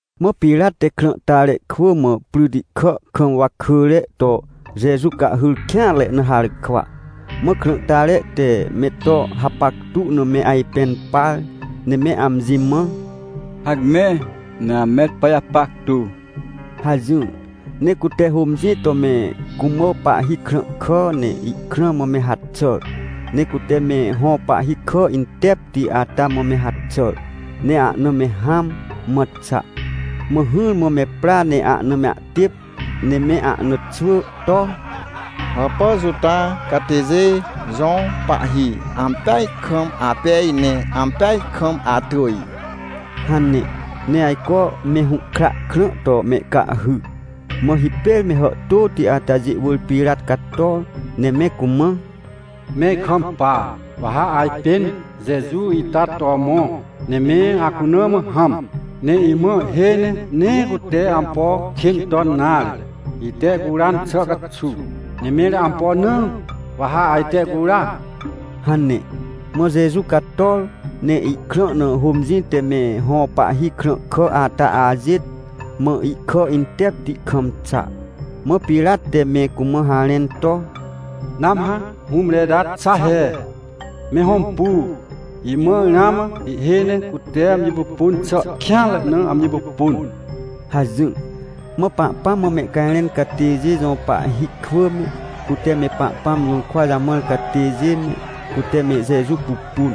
Mã Pirat te krãhtare kwỳ mã pryti kà kam wakỳre to Jeju cahhyr kêanre na harkwa. Mã krãhtare te me to hapactu na me ajpẽn par, ne me amji mã: — Hacme, ne ame to pajapactu — hajỹr. Ne cute hômjĩ to me cumã pahhi krãhkà, ne ihkrã mã me haxàr. Ne cute me hõ pahhi kà intepti ata mã me haxàr, ne ahna me hãm, mã xa. Mã hỹrmã me pra ne ahna me ahtêp ne me ahna xwỳ to: — Hàpà Juta catêjê jõ pahhi, ampeaj kam apej, ne ampeaj kam atỳj! — hane. Ne ajco me hũhkra krã to mehcahhy. Mã hipêr me hàhtôti atajê wỳr Pirat cator, ne me cumã: — Me ikampa! Wa ha ajpên Jeju ita to mõ, ne me acuna mã hãm. Ne imãa ihhêj ne nee cute ampo kên ton nare, ite ihcuran xà caxuw. Ne mẽr ampo na wa ha ajte ihcura? — hane. Mã Jeju cator, ne ihkrã na hômjĩ te me hõ pahhi krãhkà ata ajêt, mã ihkà intepti kam xa. Mã Pirat te me cumã harẽn to: — Nãmhã hũmre ita xa he! Me hõmpu, imãa ramã ihhêj ne cute amji pupun xà kêanre na amji pupun — hajỹr. Mã Pahpãm mã mehcajrẽn catêjê jõ pahhi kwỳ me, cute me Pahpãm jũrkwa jamãr catêjê me, cute me Jeju pupun,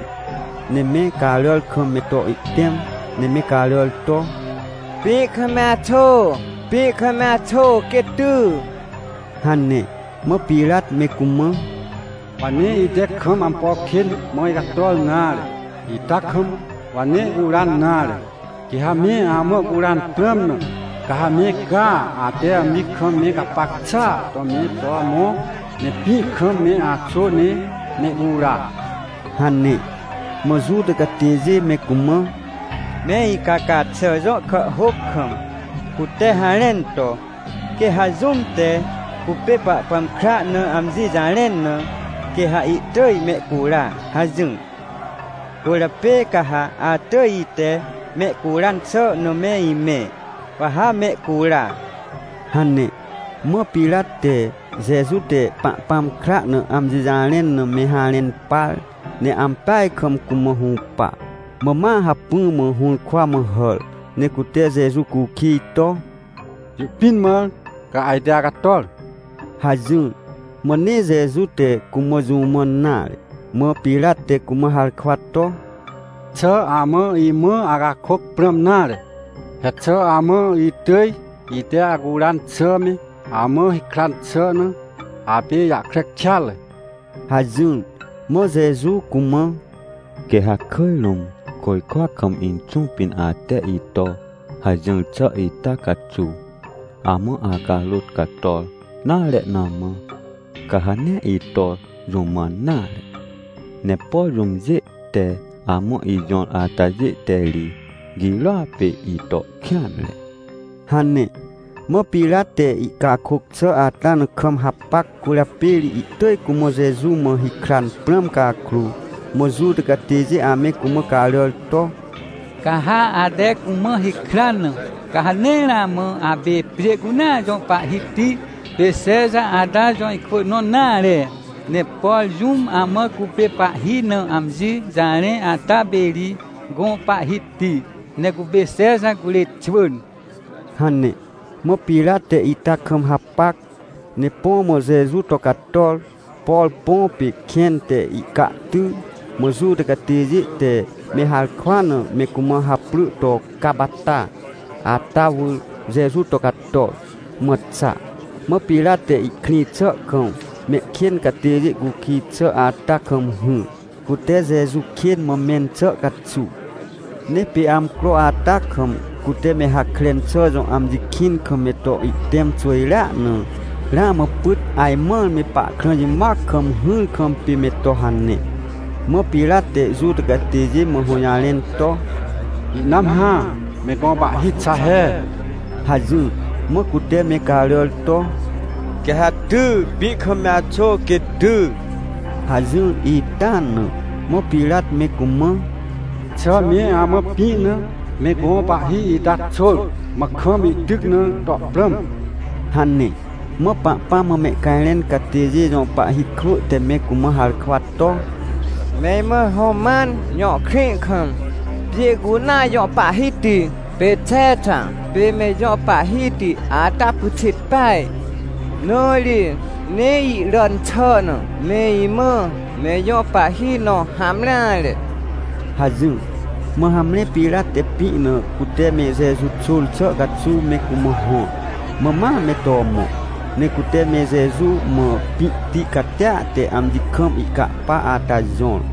ne me caràr kam me to ihtẽm, ne me caràr to: — Pĩ kam me axô! Pĩ kam me axô quê ty! — hane. Mã Pirat me cumã: — Wa nee ite kam ampo kên mã icator nare ita kam, wa nee ihcuran nare. Quê ha me amã ihcuran prãm na, ca ha me caa, ate amji kam me gapac xàa to me to mõ, ne pĩ kam me axô ne mehcura — hane. Mã Juta catêjê me cumã: — Me icaca xà jõ kàhhôc kam, cute harẽn to: “Quê ha jũm te cupê Pahpãm kra na amji jarẽn na, quê ha ihtỳj mehcura” hajỹr. Cwỳrjapê ca ha atỳj ite mehcuran xà na me imẽ, wa ha mehcura — hane. Mã Pirat te, Jeju te Pahpãm kra na amji jarẽn na, me harẽn par, ne ampeaj kam cumã hũpa. Mã ma hacpỹ mã hũrkwa mã hàr, ne cute Jeju cukij to: — Jũ pĩn mã ca ajte acator? — hajỹr. Mã nee Jeju te cumã jũ mãn nare. Mã Pirat te cumã harkwa to: — Xà amã imã acakôc prãm nare? He xà amã itỳj ite acuran xà me, amã hikran xà na, apê ijahkre kêatre? — hajỹr. Mã Jeju cumã: — Quê ha kỳj rũm côjkwa kam Inxũ pĩn ate ito hajỹr xà ita caxuw amã acarôt cator nare na mã, ca ha nee ito jũ mãn nare. Ne por jũmjê te amã ijõr atajê te ri girôa pê ito kêanre — hane. Mã Pirat te ihcakôc xà ata na kam hapac, cwỳrjapê ri ihtỳj cumã Jeju mã hikran prãm cakrô, mã Juta catêjê ame cumã caràr to: — Ca ha ate cumã hikran na, ca ha nee ramã apê pjê cunea jõ pahhiti pê Xexa ata jõ ikwỳ nõ nare! Ne por jũm amã cupê pahhi na amji jarẽ ata pê ri gõ pahhiti, ne cupê Xexa curê xwỳn! — hane. Mã Pirat te ita kam hapac, ne põ mã Jeju to cator. Por põ pê kẽn te ihcahty, mã Juta catêjê te me harkwa na me cumã haprỳ to Capata ata wỳr Jeju to cator, mã xa. Mã Pirat te ihkrĩ xà kam mehkên catêjê cukij xà ata kam hỹr, cute Jeju kên mã mẽn xà caxuw. Ne pê amcro ata kam, cute me Hakren xà jõ amji kĩn kam me to ihtẽm xwỳjrea na, ramã pyt ajmãr me pahkrã jimoac kam hỹr kam pê me to hane. Mã Pirat te Juta catêjê mã hũjarẽn to: — Ihnãm hã, me gõ Pahhi xa he! — hajỹr. Mã cute me caràr to: — Quê ha ty! Pĩ kam me axô, quê ty! — hajỹr ita na. Mã Pirat me cumã: — Xà me amã pĩ na me gõ Pahhi ita xôr, mã kam ihtyc na to prãm? — hane. Mã Pahpãm mã mehcajrẽn catêjê jõ pahhi kwỳ te me cumã harkwa to: — Me imã Roman jõ krĩ kam, pjê cunea jõ pahhiti pê Xexa pê me ijõ pahhiti ata pyxit peaj. Na ri nee iràn xà na me imã me ijõ pahhi nõ hamreare — hajỹr. Mã hamre Pirat te pĩ na cute me Jeju xôr xà caxuw me cumã hõr, mã ma me to mõ. Ne cute me Jeju mã pĩhti catia te amji kam ihcapa ata jõr.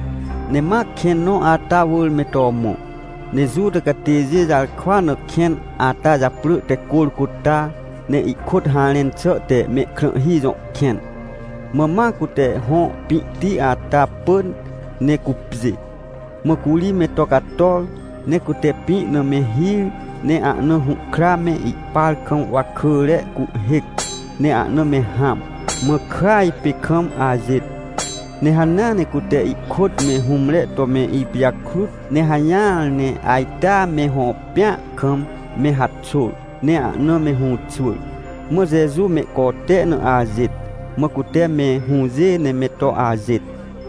Ne ma kẽn nõ ata wỳr me to mõ. Ne Juta catêjê jarkwa na kẽn ata japrỳ te Corcota, ne ihkôt harẽn xà te “Mehkrãhhi jõ kẽn”. Mã ma cute hõ pĩhti ata pỳn ne cupjê. Mã curi me to cator, ne cute pĩ na me hir, ne ahna hũhkra me ihpar kam wakỳre cuhhêc, ne ahna me hãm, mã kỳaj pê kam ajêt. Ne hanea ne cute ihkôt me hũmre to me ipijakrut, ne hajỹar ne ajtea me hõ pĩa kam me haxôr, ne ahna me hũxwỳr. Mã Jeju mehcote na ajêt, mã cute me hũjê ne me to ajêt.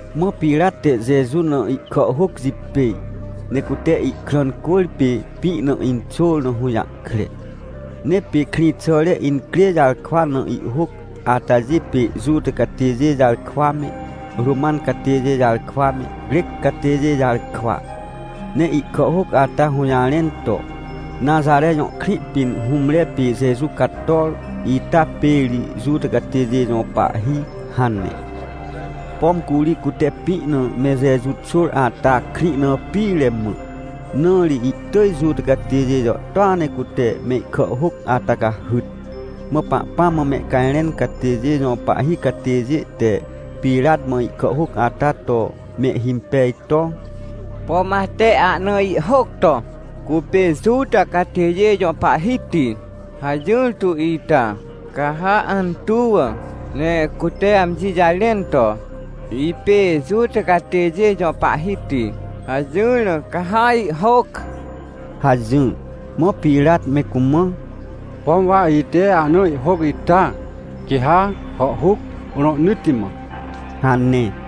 Mã Pirat te Jeju na ihkàhhôc jipêj, ne cute ihkrã cwỳrpê pĩ na inxôr na hũjahkre. Ne pê krĩxàre incrê jarkwa na ihhôc atajê pê Juta catêjê jarkwa me, Roman catêjê jarkwa me, Crec catêjê jarkwa. Ne ihkàhhôc ata hũjarẽn to: — Naxare jõ krĩ pĩn hũmre pê Jeju cator, ita pê ri Juta catêjê jõ Pahhi — hane. Pom curi cute pĩ na me Jeju xôr ata, krĩ na pire mã, na ri ihtỳj Juta catêjê jàhtôa ne cute mehkàhhôc ata cahyt. Mã Pahpãm mã mehcajrẽn catêjê jõ pahhi catêjê te Pirat mã ihkàhhôc ata to mehhimpej to: — Pom ate ahna ihhôc to: “Cupê Juta Catêjê Jõ Pahhiti” hajỹr to ita ca ha antuw, ne “Cutea amji jarẽn to, ‘Ipê Juta Catêjê Jõ Pahhiti’” hajỹr na, ca ha ihhôc — hajỹr. Mã Pirat me cumã: — Pom wa ite ahna ihhôc ita, quê ha hàhhuc rohnỳtti mã — hane.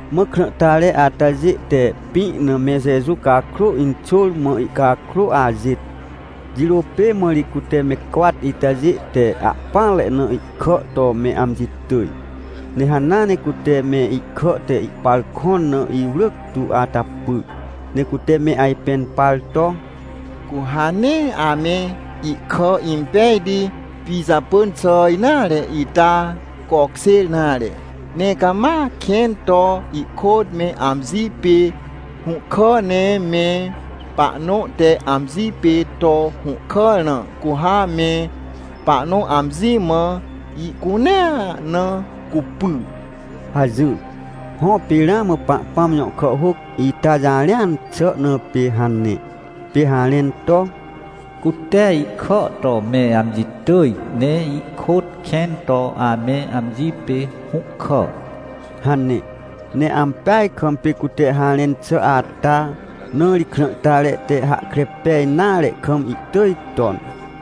Mã krãhtare atajê te pĩ na me Jeju cakrô inxôr, mã ihcakrô ajêt. Jirô pê mã ri cute me cwat itajê te ahpỹanre na ihkà to me amji tỳj. Ne hanea ne cute me ihkà te ihpar kõn na iwrỳc tu ata pyr. Ne cute me ajpẽn par to: — Cu ha nee ame ihkà impejti pijapỳn xà nare ita cokjêr nare, ne cama kẽn to ihkôt me amji pê hũhkà. Ne me pahnõ te amji pê to hũhkàr na, cu ha me pahnõ amji mã ihcunea na cupy — hajỹr. Hõ, pê ramã Pahpãm jõ kàhhôc ita jarẽan xà na pê hane, pê harẽn to: “Cute ikà to me amji tỳj, ne ihkôt kẽn to ame amji pê hũhkà” hane. Ne ampeaj kam pê cute harẽn xà ata. Na ri krãhtare te hahkre pej nare kam ihtỳj ton.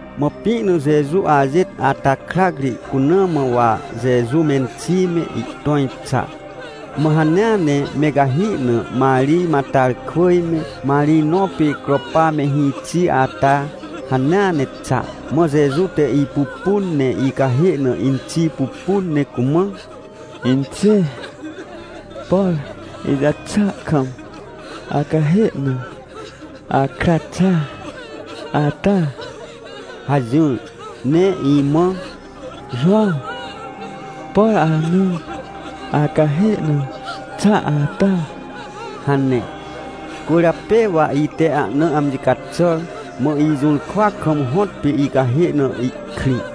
Mã pĩ na Jeju ajêt ata krac ri cuna mã wa Jeju menxi me, ihtõj xa, mã hanea ne me cahi na Marij Matarkwỳj me, Marij nõ pê Cropa me hĩxi ata, hanea ne xa. Mã Jeju te ipupun, ne icahê na inxi pupun, ne cumã: — Inxê, por ijaxà kam acahê na akra xa ata — hajỹr. Ne imã: — Jowãw, por ana acahê na xa ata — hane. Cwỳrjapê wa ite ahna amji caxàr, mã ijũrkwa kam hõtpê icahê na ihkrĩ.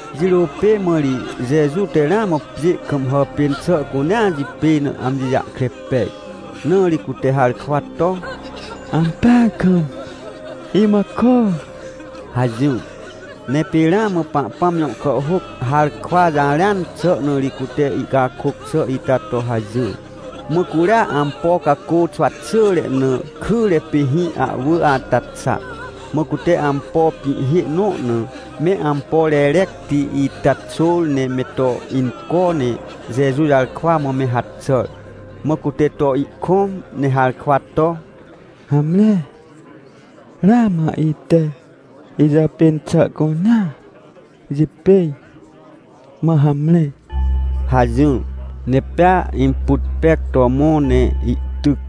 Jirô pê mã ri Jeju te ramã pjê kam hàpên xà cunea jipêj na amji jahkre pej, na ri cute harkwa to: — Ampeaj kam imã kôr — hajỹr. Ne pê ramã Pahpãm jõ kàhhôc harkwa jarẽan xà na ri cute ihcakôc xà ita to hajỹr. Mã curia ampo cacô xwa xỳre na kyre pê hĩ ahwỳ ata xa, mã cute ampo pĩhhê nõ na, me ampo rerecti ita xôr, ne me to inco, ne Jeju jarkwa mã me haxàr. Mã cute to ihkõm ne harkwa to: — Hamre, ramã ite ijàpên xà cunea jipêj, mã hamre! — hajỹr. Ne pea imput pec to mõ ne ihtyc.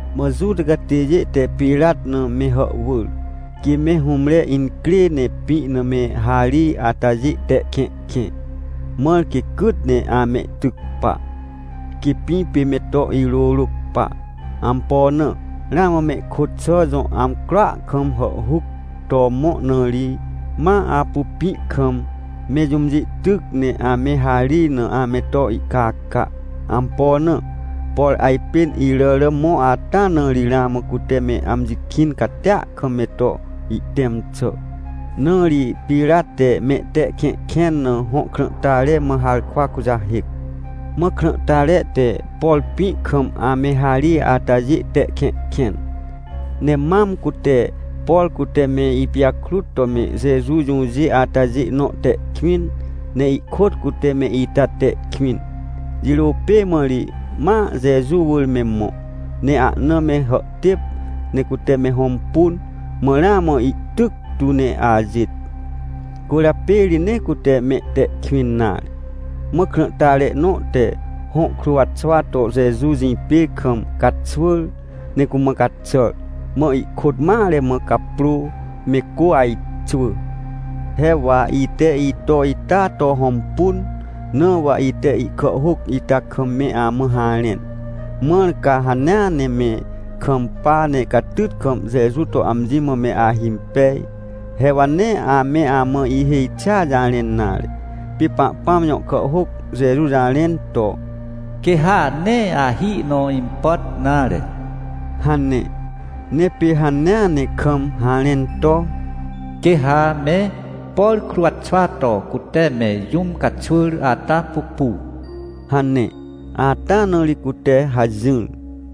Mã Juta catêjê te Pirat na me hàhwỳr, quê me hũmre incrê ne pĩ na me harij atajê te kẽhkẽ, mãr quê cyt ne amehtyc pa, quê pĩ pê me to irôrôc pa. Ampo na? Ramã mehkôt xà jõ amcroa kam hàhhuc to mõ, na ri ma apu pĩ kam me jũmjê tyc ne ame harij na ame to ihcaca. Ampo na? Por ajpên iràrà mõ ata na ri ramã cute me amji kĩn catia kam me to ihtẽm xà. Na ri Pirat te mehte kẽhkẽn na hõ krãhtare mã harkwa kujahêc. Mã krãhtare te, por pĩ kam ame harij atajê te kẽhkẽn. Ne mam cute, por cute me ipijakrut to me Jeju jũjê atajê nõ te kwĩn, ne ihkôt cute me ita te kwĩn. Jirô pê mã ri ma Jeju wỳr me mõ, ne ahna me hàhtêp ne cute me hõmpun, mã ramã ihtyc tu ne ajêt. Cwỳrjapê ri nee cute mehte kwĩn nare. Mã krãhtare nõ te hõ kruwxwa to Jeju jĩpê kam caxwỳr, ne cumã caxàr, mã ihkôt mare mã caprô me cô ajxwỳ. He wa ite ito ita to hõmpun, na wa ite ihkàhhôc ita kam me amã harẽn, mãr ca hanea ne me kampa, ne catyt kam Jeju to amji mã me ahimpej. He wa nee ame amã ihêj xi jarẽn nare. Pê Pahpãm jõ kàhhôc Jeju jarẽn to: — Quê ha nee ahi nõ impàt nare — hane. Ne pê hanea ne kam harẽn to: — Quê ha me, por kruwxwa to cute me jũm caxwỳr ata pupu — hane, ata na ri cute hajỹr.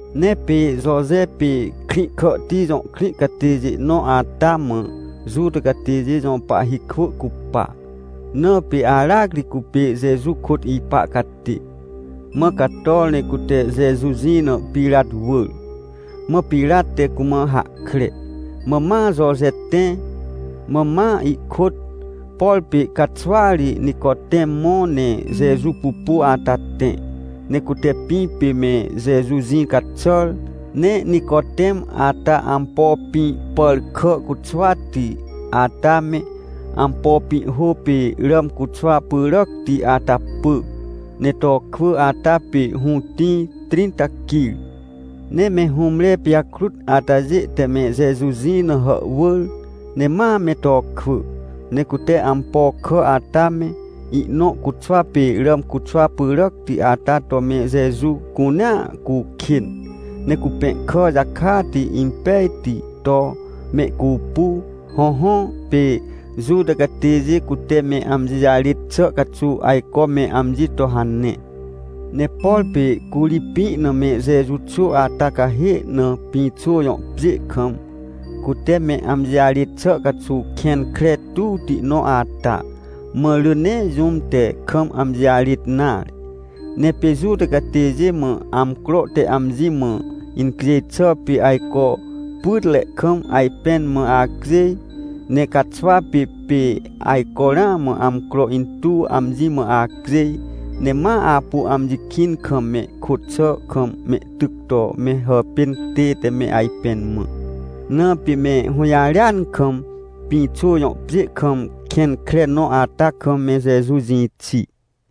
Ne pê Joje pê Krĩhkàhti jõ krĩ catêjê nõ ata mã, Juta catêjê jõ pahhi kwỳ cupa, na pê aracri cupê Jeju kôt ipa catê. Mã cator ne cute Jeju jĩ na Pirat wỳr. Mã Pirat te cumã hahkre. Mã ma Joje tẽ. Mã ma ihkôt, por pê caxwa ri Nicotem mõ ne Jeju pupu ata tẽ, ne cute pĩ pê me Jeju jĩ caxàr. Ne Nicotem ata ampo pĩ pàrkà cuxwati ata me, ampo pĩhhô pê ràm cuxwa pyràcti ata pỳ, ne to kwỳ ata pê hũtĩ trĩnta quir. Ne me hũmre pijakrut atajê te me Jeju jĩ na hàhwỳr, ne ma me to kwỳ, ne cute ampo kà ata me, ihnõ cuxwa pê ràm cuxwa pyràcti ata to me Jeju cunea cukên, ne cupẽhkà jakati impejti to mehcupu. Hõhõ, pê Juta catêjê cute me amji jarêt xà caxuw ajco me amji to hane. Ne por pê curi pĩ na me Jeju xô ata cahê na, pĩxô jõ pjê kam, cute me amji jarêt xà caxuw kẽn kre tuwti nõ ata, mã rỳ nee jũm te kam amji jarêt nare. Ne pê Juta catêjê mã amcro te amji mã incjêj xà pê, ajco pytre kam ajpẽn mã acjêj. Ne caxwa pê, pê ajco ramã amcro intuw amji mã acjêj. Ne ma apu amji kĩn kam mehkôt xà kam mehtyc to me hàpên tête me ajpẽn mã. Na pê me hũjarêan kam pĩxô jõ pjê kam kẽn kre nõ ata kam, me Jeju jĩ xi.